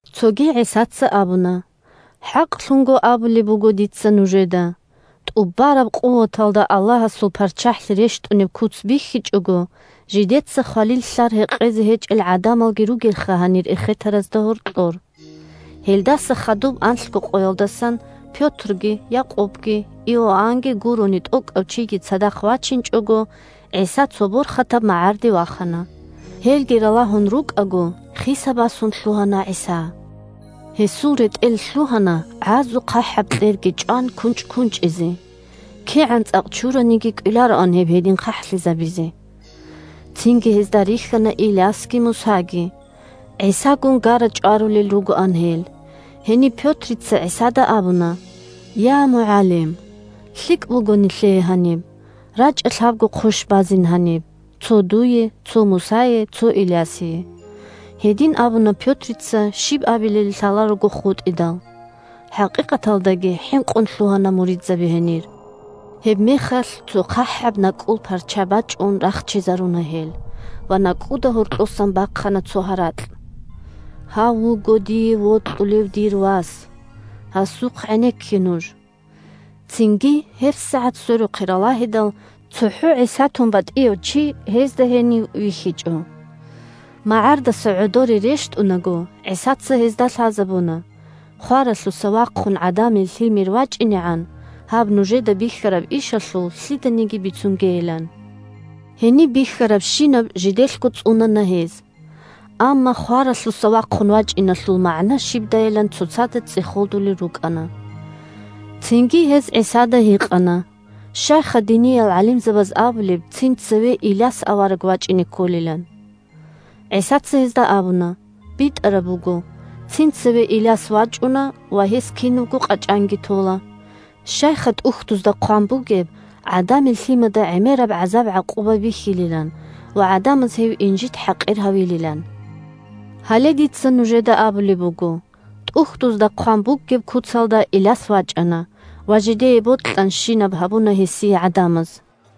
Цоги ГӀисаца абуна: – ХӀакълъун абулеб буго дица нужеда: тӀубараб къуваталда Аллагьасул ПарччахӀлъи рещтӀунеб куц бихьичӀого, жидеца хвалил лълъар гьекъезе гьечӀел гӀадамалги ругелха гьанир эхетаразда гьоркьор. Гьелдаса хадуб анлъго къоялдасан, Пётрги, Якъубги, Иоаннги гурони тӀокӀав чиги цадахъ вачинчӀого, ГӀиса цо борхатаб магӀарде вахана. Гьелги ралагьун рукӀаго, хиса-басун лъугьана ГӀиса. Гьесул ретӀел лъугьана, гӀазухъахӀаб кьерги чӀван, кунчӀ-кунчӀизе; кигӀан цӀакъ чураниги кӀвелароан гьеб гьедин хъахӀлъизабизе. Цинги гьезда рихьана Илясги Мусаги. ГӀисагун гара-чӀварулел ругоан гьел. Гьениб Пётрица ГӀисада абуна: – Я МугӀалим! ЛъикӀ буго гьаниб нилъее! РачӀа, лъабго хъощ базин гьаниб: цо дуе, цо Мусае, цо Илясие. Гьедин абуна Пётрица, щиб абилебали лъаларого хутӀидал. ХӀакъикъаталдаги хӀинкъун лъугьана муридзаби гьенир. Гьебмехалъ цо хъахӀаб накӀкӀул парча бачӀун рахчизаруна гьел ва накӀкӀуда гьоркьосан бахъана цо гьаракь: – Гьав вуго дие вокьулев дир Вас. Гьасухъ гӀенекке нуж! Цинги гьебсагӀат сверухъе ралагьидал, цохӀо ГӀиса тун батӀияв чи гьезда гьенив вихьичӀо. МагӀардаса гӀодоре рещтӀунаго, ГӀисаца гьезда лъазабуна хваралъуса вахъун ГӀадамил Лъимер вачӀинегӀан, гьаб нужеда бихьараб ишалъул лъиданиги бицунгейилан. Гьениб бихьарабщинаб жиделъго цӀунана гьез. Амма «хваралъуса вахъун вачӀиналъул» магӀна щибдайилан цоцазда цӀехолдулел рукӀана. Цинги гьез ГӀисада гьикъана: – Щайха диниял гӀалимзабаз абулеб цин цеве Иляс авараг вачӀине кколилан? ГӀисаца гьезда абуна: – БитӀараб буго, цин цеве Иляс вачӀуна ва гьес кинабго къачӀанги тола. Щайха ТӀухьдузда хъван бугеб ГӀадамил Лъимада гӀемераб гӀазаб-гӀакъуба бихьилилан ва гӀадамаз гьев инжит-хӀакъир гьавилилан? Гьале дица нужеда абулеб буго: ТӀухьдузда хъван бугеб куцалда, Иляс вачӀана; ва жидее бокьанщинаб гьабуна гьесие гӀадамаз.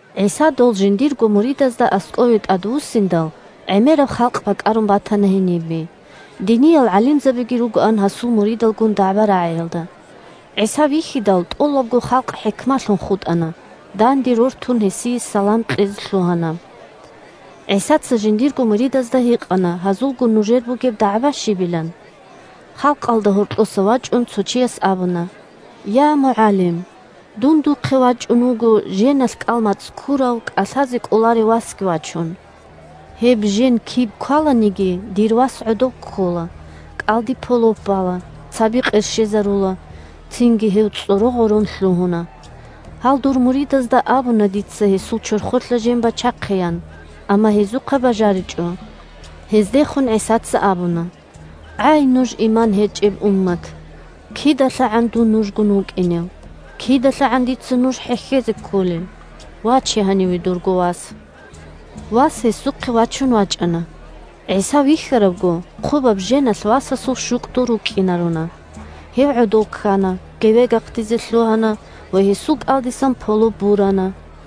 ГӀиса дол жиндирго муридазда аскӀове тӀадвуссиндал, гӀемераб халкъ бакӀарун батана гьенибе. Диниял гӀалимзабиги ругоан гьасул муридалгун дагӀба-рагӀиялда. ГӀиса вихьидал, тӀолабго халкъ хӀикмалъун хутӀана, данде рортун гьесие салам кьезе лъугьана. ГӀисаца жиндирго муридазда гьикъана гьазулгун нужер бугеб дагӀба щибилан? Халкъалда гьоркьоса вачӀун цо чияс абуна: – Я МугӀалим! Дун духъе вачӀун вуго женалъ кӀал-мацӀ ккурав, кӀалъазе кӀоларев васги вачун. Гьеб жен киб кваланиги, дир вас гӀодов ккола, кӀалдиб полоп бала, цаби къерщезарула, цинги гьев цӀоро-гъорон лъугьуна. Гьал дур муридазда абуна дица гьесул чорхолъа жен бачахъеян, амма гьезухъа бажаричӀо. Гьездехун ГӀисаца абуна: – ГӀай, нуж иман гьечӀеб уммат! КидалъагӀан дун нужгун вукӀинев? КидалъагӀан дица нуж хӀехьезе кколел? Ваче гьаниве дурго вас. Вас гьесухъе вачун вачӀана. ГӀиса вихьаравго, хъубаб женалъ васасул щукӀдул рукӀкӀинаруна; гьев гӀодов ккана, гевегахъдизе лъугьана ва гьесул кӀалдисан полоп бурана.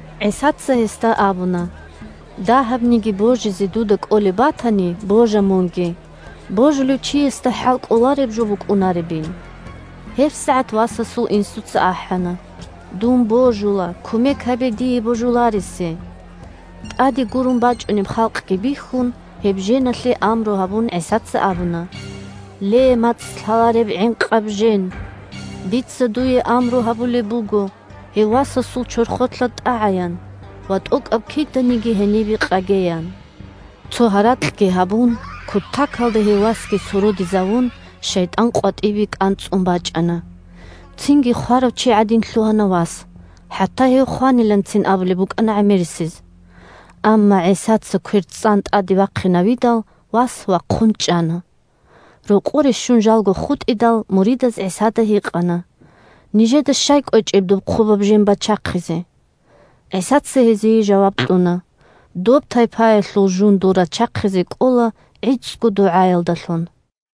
ГӀисаца гьесда абуна: – Дагьабниги божизе дудаги кӀолеб батани, божа мунги. Божулев чиясда хӀалкӀолареб жо букӀунаребин! ГьебсагӀат васасул инсуца ахӀана: – Дун божула, кумек гьабе дие – божуларесе! ТӀаде гурун бачӀунеб халкъги бихьун, гьеб женалъе амру гьабун, ГӀисаца абуна: – Ле, мацӀ лъалареб ва гӀинкъаб жен! Дица дуе амру гьабулеб буго гьев васасул чорхолъа тӀагӀаян ва тӀокӀаб киданиги гьенибеги къагеян. Цо гьаракьги гьабун, кутакалда гьев васги сородизавун, шайтӀан къватӀибе кӀанцӀун бачӀана. Цинги хварав чи гӀадин лъугьана вас, хӀатта гьев хваниланцин абулеб букӀана гӀемерисез. Амма ГӀисаца квер цӀан тӀаде вахъинавидал, вас вахъун чӀана. Рокъоре щун, жалго хутӀидал, муридаз ГӀисада гьикъана: – Нижеда щай кӀвечӀеб доб хъубаб жен бачахъизе? ГӀисаца гьезие жаваб кьуна: – Доб тайпаялъул жундул рачахъизе кӀола гӀицӀго дугӀаялдалъун.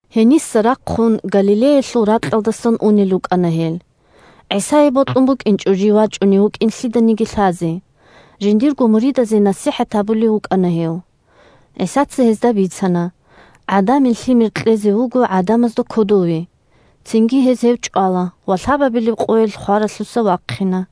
Гьениса рахъун Галилеялъул ракьалдасан унел рукӀана гьел. ГӀисае бокьун букӀинчӀо жив вачӀунев вукӀин лъиданиги лъазе. Жиндирго муридазе насихӀат гьабулев вукӀана гьев. ГӀисаца гьезда бицана: – ГӀадамил Лъимер кьезе вуго гӀадамазда кодове, цинги гьез гьев чӀвала ва лъабабилеб къоялъ хваралъуса вахъина.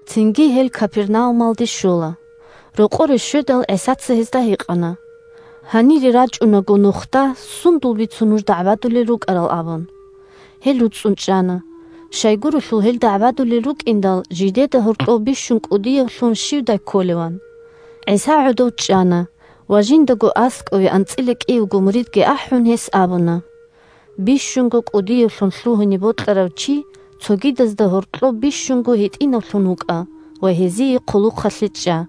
Цинги гьел Капернаумалде щола. Рокъоре щведал, ГӀисаца гьезда гьикъана: – Гьанире рачӀунаго нухда сундул бицун дагӀбадулел нуж рукӀарал? – абун. Гьел руцӀцӀун чӀана. Щайгурелъул гьел дагӀбадулел рукӀиндал жидеда гьоркьов бищун кӀудиявлъун щивдай кколеван. ГӀиса гӀодов чӀана, ва жиндаго аскӀове анцӀила кӀиявго муридги ахӀун, гьес абуна: – Бищунго кӀудиявлъун лъугьине бокьарав чи цогидазда гьоркьов бищунго гьитӀинавлъун вукӀа ва гьезие хъулухъалъе чӀа.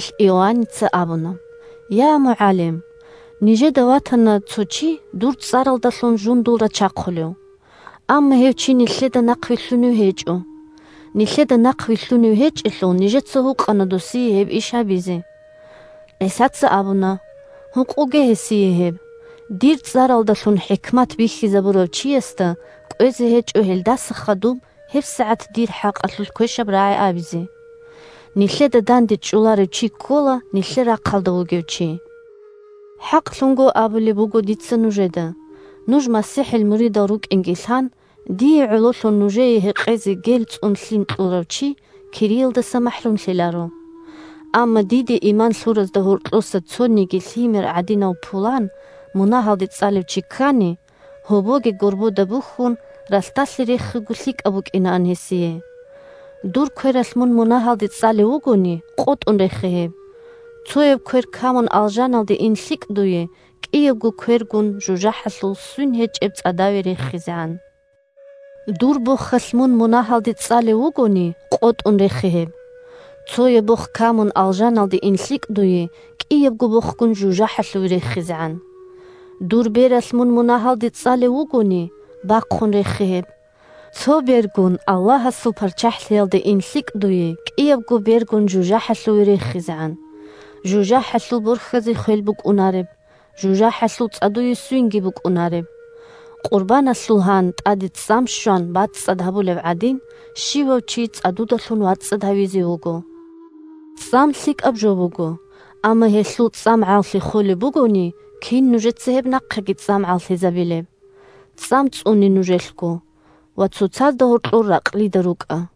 Гьебмехалъ Иоанница абуна: – Я МугӀалим! Нижеда ватана цо чи дур цӀаралдалъун жундул рачахъулев; амма гьев чи нилъеда нахъвилълъунев гьечӀо. Нилъеда нахъвилълъунев гьечӀелъул, нижеца гьукъана досие гьеб иш гьабизе. ГӀисаца абуна: – Гьукъуге гьесие гьеб. Дир цӀаралдалъун хӀикмат бихьизабурав чиясда кӀвезе гьечӀо гьелдаса хадуб гьебсагӀат дир хӀакъалъулъ квешаб рагӀи абизе. Нилъеда дандечӀоларев чи ккола нилъер рахъалда вугев чи. ХӀакълъун абулеб буго дица нужеда: нуж МасихӀил муридал рукӀинги лъан, дие гӀололъун нужее гьекъезе гел цӀун лъим кьурав чи кириялдаса махӀрумлъиларо. Амма диде иман лъуразда гьоркьоса цониги лъимер гӀадинав пулан мунагьалде цӀалев чи ккани, гьобоги горбода бухьун, ралъдалъе рехиго лъикӀаб букӀинаан гьесие. «Мун мунагьалде цӀалев вугони…» Дур квералъ мун мунагьалде цӀалев вугони, къотӀун рехе гьеб. Цояб квер камун, алжаналде ин лъикӀ дуе, кӀиябго квергун жужахӀалъул свин гьечӀеб цӀадаве рехизегӀан. Дур бохалъ мун мунагьалде цӀалев вугони, къотӀун рехе гьеб. Цояб бох камун, алжаналде ин лъикӀ дуе, кӀиябго бохгун жужахӀалъуве рехизегӀан. Дур бералъ мун мунагьалде цӀалев вугони, бахъун рехе гьеб. Цо бергун Аллагьасул ПарччахӀлъиялде ин лъикӀ дуе, кӀиябго бергун жужахӀалъуве рехизегӀан. ЖужахӀалъул борхьазе хвелги букӀунареб, жужахӀалъул цӀадуе свинги букӀунареб! Къурбаналъул гьан, тӀаде цӀам щван, бацӀцӀад гьабулеб гӀадин, щивав чи цӀадудалъун вацӀцӀад гьавизе вуго. ЦӀам лъикӀаб жо буго. Амма гьелъул цӀамгӀаллъи холеб бугони, кин нужеца гьеб нахъеги цӀамгӀаллъизабилеб? ЦӀам цӀуне нужелъго, ва цоцазда гьоркьор ракълида рукӀа.